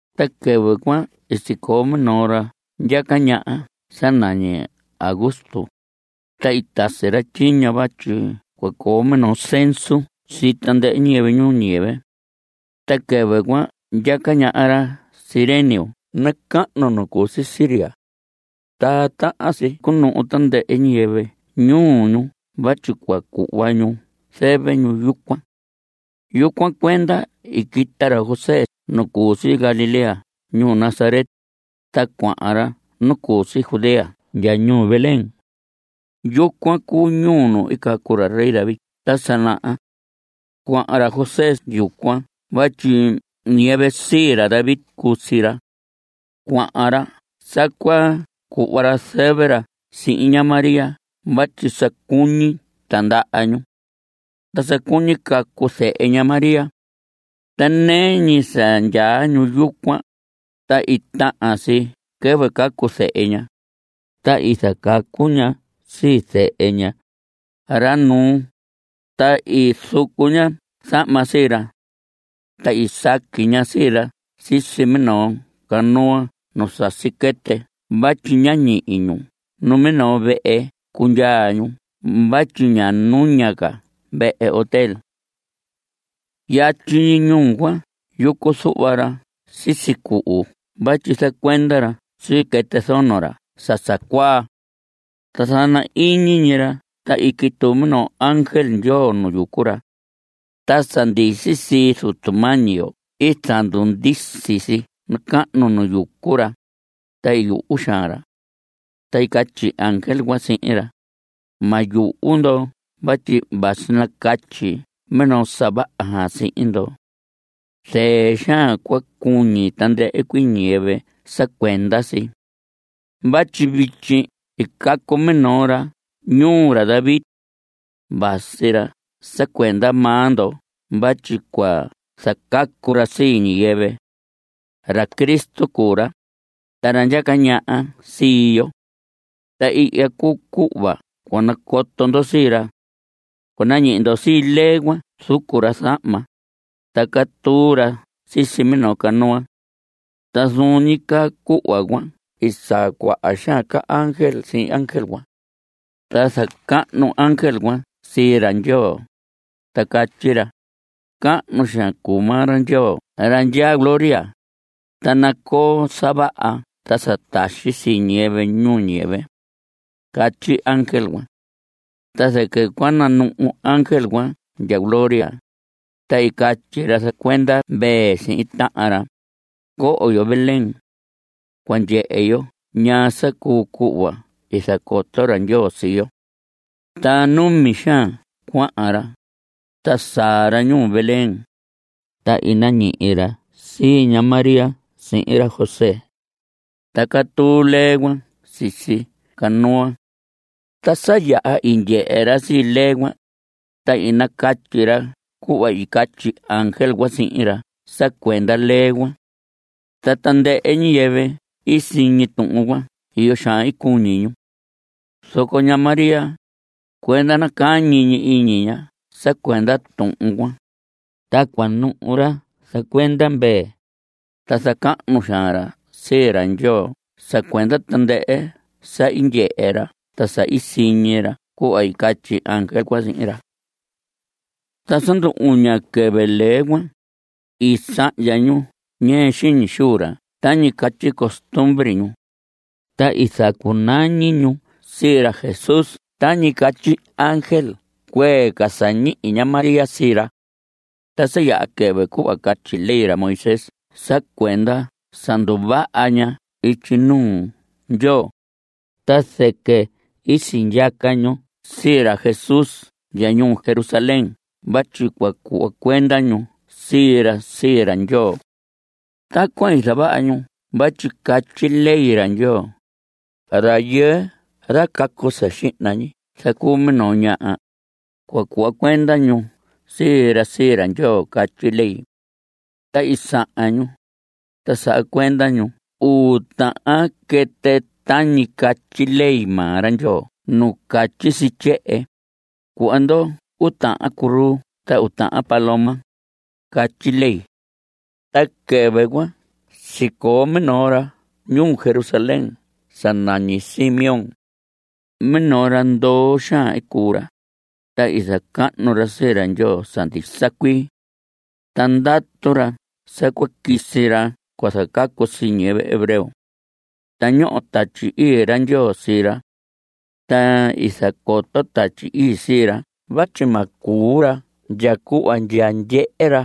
Ta quɨvɨ cuan sicoo minoo ra ndyaca ñaha sa nañi Augusto, ta i tasi ra tyiño vatyi cua coo minoo censo sii tandɨhɨ ñiyɨvɨ ñuu ñiyɨvɨ. Ta quɨvɨ cuan ndyaca ñaha ra Cirenio nacahnu nu cu si Siria. Ta tahan si cunuhu tandɨhɨ ñiyɨvɨ ñuu ñu vatyi cua cuhva ñu zɨvɨ ñu yucuan. Yucuan cuenda i quita ra José nu cu si Galilea ñuu Nazaret, ta cuahan ra nu cu si Judea ndya ñuu Belén. Yucuan cuu ñuu nu i cacu ra rey David ta sa naha. Cuahan ra José yucuan vatyi ñiyɨvɨ sii ra David cuu sii ra. Cuahan ra sa cua cuhva ra zɨvɨ ra sihin ña María vatyi sa cuñi tindaha ñu. Ta sa cuñi cacu zehe ña María. Ta nɨɨ ñi sa ndyaa ñu yucuan, ta i tahan si quɨvɨ cacu zehe ña. Ta i zacacu ña sii zehe ña, ra nuu, ta i zucu ña zahma sii ra. Ta i saqui ña sii ra sisi minoo canua nu sasi quɨtɨ vatyi ñá ñihi ñu minoo vehe cundyaa ñu vatyi ña nuña ca vehe hotél. Yatyi ñuu cuan yucu zuhva ra sisi cuhu vatyi zacuenda ra sii quɨtɨ zono ra sa sa cuaa. Ta zana ñi iñi ra ta i quituu minoo ángel Ndyoo nu yucu ra. Ta sa ndisi sii Zutu mañi yo i zandundisi si nacahnu nu yucu ra, ta i yuhu xaan ra. Ta i catyi ángel cuan sihin ra: Ma yuhu ndo vatyi vasi nacatyi minoo sa vaha xaan sihin ndo. Zɨɨ xaan cua cuñi tandɨhɨ ñiyɨvɨ sa cuenda si. Vatyi vityi i cacu minoo ra ñuu ra David. Vasi ra sa cuenda maa ndo vatyi cua zacacu ra sii ñiyɨvɨ. Ra Cristo cuu ra, ta ra ndyaca ñaha sii yo. Ta ihya cuu cuhva cua nacoto ndo sii ra. Cua nañihi ndo sii lee cuan zucu ra zahma, ta catuu ra sisi minoo canua. Ta zuun ñi caa cuhva cuan i saa cuaha xaan ca ángel sihin ángel cuan. Ta zacahnu ángel cuan sii ra Ndyoo, ta catyi ra: Cahnu xaan cuu maa ra Ndyoo ra ndyaa gloria, ta nacoo sa vaha ta sa taxi sii ñiyɨvɨ ñuu ñiyɨvɨ. Catyi ángel cuan. Ta zɨquɨ cua nanuhu ángel cuan ndya gloria, ta i catyi ra zacuenda mvee sihin tahan ra: Coho yo Belén. Cua ndyehe yo ñaa sa cuu cuhva i zacoto ra Ndyoo sii yo. Ta numi xaan cuahan ra, ta saa ra ñuu Belén, ta i nañihi ra sii ña María sihin ra José. Ta catuu lee cuan sisi canua. Ta sa yaha i ndyehe ra sii lee cuan, ta i nacatyi ra cuhva i catyi ángel cuan sihin ra sa cuenda lee cuan. Ta tandɨhɨ ñiyɨvɨ i siñi tuhun cuan iyo xaan i cuñi ñu. Zoco ña María, cuenda nacañi ñi iñi ña sa cuenda tuhun cuan. Ta cuanuhu ra zacuenda mvee, ta zacahnu xaan ra sii ra Ndyoo sa cuenda tandɨhɨ sa i ndyehe ra ta sa i siñi ra cuhva i catyi ángel cuan sihin ra. Ta sa ndu‑uña quɨvɨ lee cuan, i sahndya ñu ñɨɨ xiñi xuu ra tañi catyi costumbre ñu, ta i zacunañi ñu sii ra Jesús tañi catyi ángel cuee ca sa ñihi ña María sii ra. Ta sa yaha quɨvɨ cuhva catyi ley ra Moisés sa cuenda sa nduvaha ña ityi nuu Ndyoo, ta zɨquɨ sindyaca ñu sii ra Jesús ndya ñuu Jerusalén vatyi cua cuhva cuenda ñu sii ra sii ra Ndyoo. Tacuan i zavaha ñu vatyi catyi ley ra Ndyoo: “Rayɨɨ ra cacu sa xihna ñi zacuu minoo ñaha, cua cuhva cuenda ñu sii ra sii ra Ndyoo”, catyi ley. Ta i sahan ñu, ta saha cuenda ñu uu tahan quɨtɨ tañi catyi ley maa ra Ndyoo nu catyi si tyehen: “Cuhva ndo uu tahan curuu a uu tahan paloma”, catyi ley. Ta quɨvɨ cuan sicoo minoo ra ñuu Jerusalén sa nañi Simeón. Minoo ra ndoo xaan i cuu ra, ta i zacahnu ra sii ra Ndyoo sa ndisa cuii. Ta ndatu ra sa cua quisi ra cua zacacu sii ñiyɨvɨ hebreo. Ta ñoho Tatyi Ii ra Ndyoo sii ra. Ta i zacoto Tatyi Ii sii ra vatyi ma cuu ra ndya cuhva ndya ndyehe ra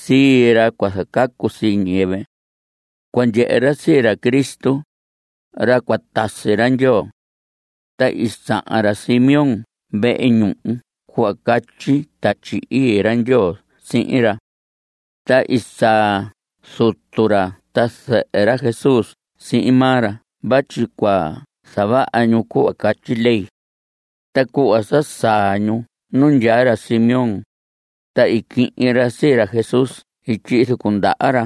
sii ra cua zacacu sii ñiyɨvɨ. Cua ndyehe ra sii ra Cristo, ra cua tasi ra Ndyoo. Ta i sahan ra Simeón vehe ñuhu cuhva catyi Tatyi Ii ra Ndyoo sihin ra. Ta i saa zutu ra ta zɨhɨ ra Jesús sihin maa ra vatyi cua zavaha ñu cuhva catyi ley. Ta cuhva sa saa ñu nu ndyaa ra Simeón, ta i quihin ra sii ra Jesús i tyihi zucu ndaha ra.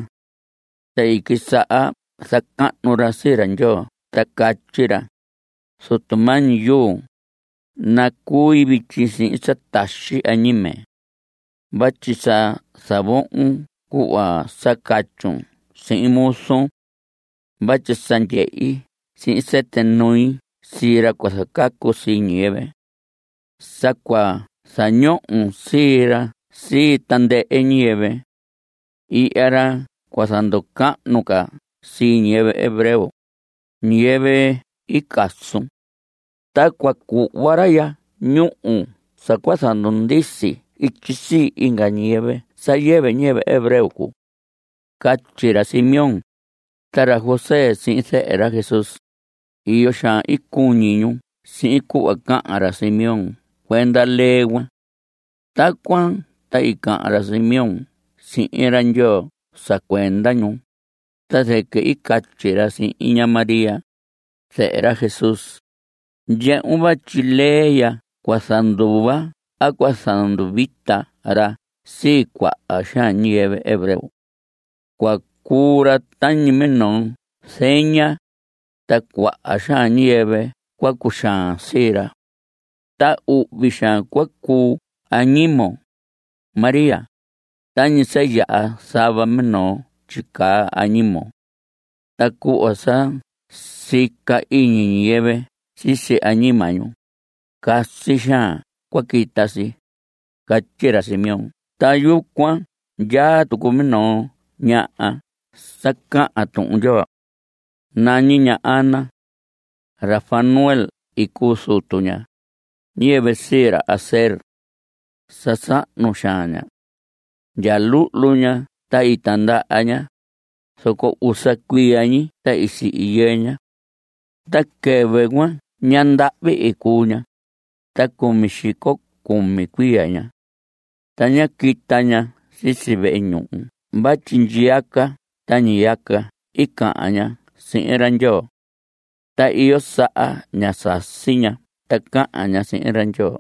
Ta i quisaha zacahnu ra sii ra Ndyoo ta catyi ra: Zutu mañi yuu, nacui vityi sihin sa taxi añime. Vatyi sa zavohon cuhva sa catyun sihin muzun. Vatyi sa ndyehi sihin sɨtɨ nui sii ra cua zacacu sii ñiyɨvɨ. Sa cua zañohon sii ra sii tandɨhɨ ñiyɨvɨ. Ihya ra cua zanducahnu ca sii ñiyɨvɨ hebreo, ñiyɨvɨ i casun. Ta cua cuhva ra ya ñúhu sa cua zandundisi ityi sii inga ñiyɨvɨ sa yɨvɨ ñiyɨvɨ hebreo cuu. Catyi ra Simeón. Ta ra José sihin zɨhɨ ra Jesús, iyo xaan i cuñi ñu sihin cuhva cahan ra Simeón cuenda lee cuan. Tacuan ta i cahan ra Simeón sihin ra Ndyoo sa cuenda ñu, ta zɨquɨ i catyi ra sihin ña María, zɨhɨ ra Jesús: Ndyehun vatyi lee ya cua zanduva a cua zanduvita ra sii cuaha xaan ñiyɨvɨ hebreo. Cua cuu ra tañi minoo zeña, ta cuaha xaan ñiyɨvɨ cua cuxaan sii ra. Ta uhvi xaan cua cuu añimon, María, tañi sa yaha zava minoo tyicaa añimon. Ta cuhva sa sica iñi ñiyɨvɨ sisi añima ñu, casi xaan cua quita si. Catyi ra Simeón. Ta yucuan ndyaa tucu minoo ñaha sa cahan Tuhun Ndyoo. Nañi ña Ana. Ra Fanuel i cuu zutu ña, ñiyɨvɨ sii ra Aser. Sa sahnu xaan ña. Ndya luhlu ña ta tindaha ña, zoco usa cuiya ñi ta i sihi yɨɨ ña. Ta quɨvɨ cuan ñandahvi i cuu ña, ta cumi xico cumi cuiya ña. Ta ñá quita ña sisi vehe ñuhu vatyi ñiyaca ta ndyiyaca i cahan ña sihin ra Ndyoo. Ta iyo saha ñá sasi ña ta cahan ña sihin ra Ndyoo.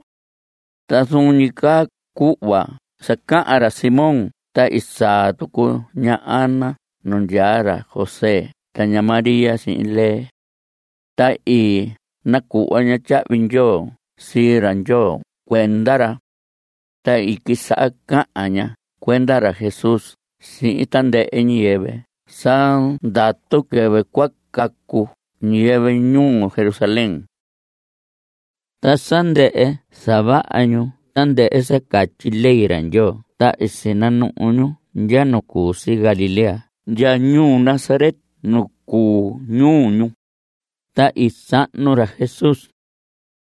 Ta zuun ñi caa cuhva sa cahan ra Simón ta i saa tucu ña Ana nu ndyaa ra José ta ña María sihin lee. Ta i nacuhva ña tyahvi ndyoo sii ra Ndyoo cuenda ra. Ta i quisaha cahan ña cuenda ra Jesús sihin tandɨhɨ ñiyɨvɨ sa ndatu quɨvɨ cua cacu ñiyɨvɨ ñuu Jerusalén. Ta sa ndɨhɨ zavaha ñu tandɨhɨ sa catyi ley ra Ndyoo ta i sinanuhu ñu ndya nu cu si Galilea ndya ñuu Nazaret nu cuu ñuu ñu. Ta i sahnu ra Jesús.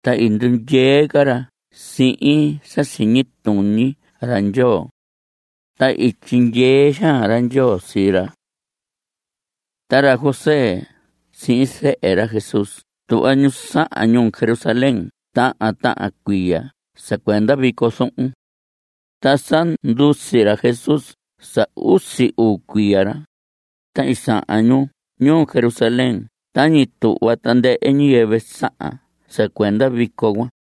Ta i ndundyee ca ra sihin sa siñi tuñi ra Ndyoo. Ta i tyindyee xaan ra Ndyoo sii ra. Ta ra José sihin zɨhɨ ra Jesús tuhva ñu sahan ñuu Jerusalén tahan tahan cuiya sa cuenda vico zuhun. Ta sa ndusi ra Jesús sa usi uu cuiya ra, ta i sahan ñu ñuu Jerusalén tañi tuhva tandɨhɨ ñiyɨvɨ sahan sa cuenda vico cuan.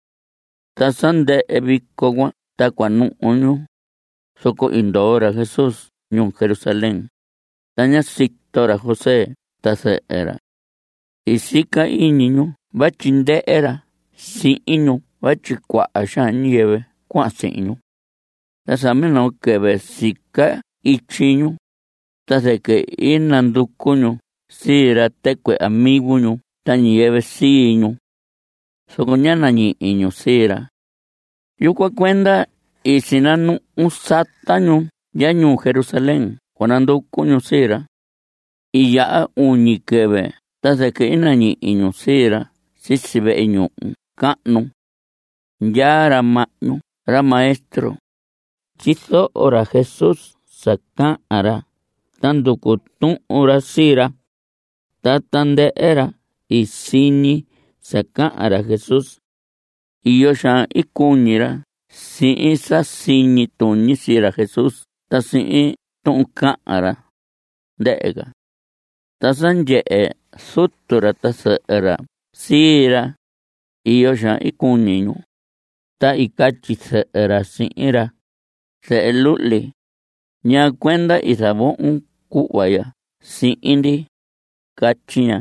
Ta sa ndɨhɨ vico cuan ta cua nuhu ñu, zoco i ndoo ra Jesús ñuu Jerusalén, ta ñá sito ra José ta zɨhɨ ra. I sica iñi ñu vatyi ndɨhɨ ra sihin ñu vatyi cuaha xaan ñiyɨvɨ cuahan sihin ñu. Ta sa minoo quɨvɨ sica ityi ñu, ta zɨquɨ i nanducu ñu sii ra tɨcuɨ amigo ñu ta ñiyɨvɨ sii ñu. Zoco ñá nañihi ñu sii ra. Yucuan cuenda i sinanuhu sata ñu ndya ñuu Jerusalén cua nanducu ñu sii ra. I yaha uñi quɨvɨ ta zɨquɨ i nañihi ñu sii ra sisi vehe ñuhu cahnu. Ndyaa ra mahñu ra maestro. Tyizoho ra Jesús sa cahan ra ta nducu tuhun ra sii ra. Ta tandɨhɨ ra i siñi sa cahan ra Jesús, iyo xaan i cuñi ra sihin sa siñi tuñi sii ra Jesús ta sihin tuhun cahan ra, ndɨhɨ ca. Ta sa ndyehe zutu ra ta zɨhɨ ra sii ra, iyo xaan i cuñi ñu. Ta i catyi zɨhɨ ra sihin ra: Zehe luhli, ¿ñaa cuenda i zavohon cuhva ya sihin ndi? Catyi ña.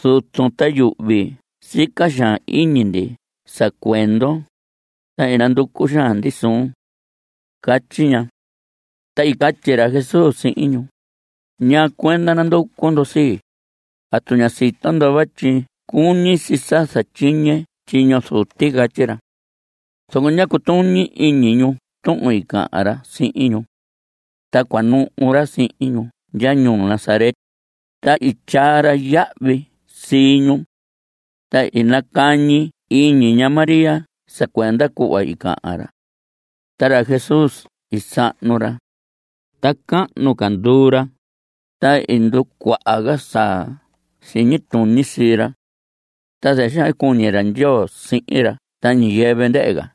Zutun ta yuhvi i sica xaan iñi ndi sa cuendon, ta i nanducu xaan ndi suun. Catyi ña. Ta i catyi ra Jesús sihin ñu: ¿Ñaa cuenda nanducu ndo sii? ¿Atu ña sito ndo vatyi cuñi si sa zatyiñe tyiño Zuti? Catyi ra. Zoco ñá cutuñi iñi ñu tuhun cahan ra sihin ñu. Ta cua nuhu ra sihin ñu ndya ñuu Nazaret, ta i tyaa ra yahvi sii ñu. Ta i nacañi iñi ña María sa cuenda cuhva i cahan ra. Ta ra Jesús i sahnu ra, ta cahnu ca nduu ra, ta i nducuaha ca sa siñi tuñi sii ra. Ta zɨɨ xaan i cuñi ra Ndyoo sihin ra ta ñiyɨvɨ ndɨhɨ ca.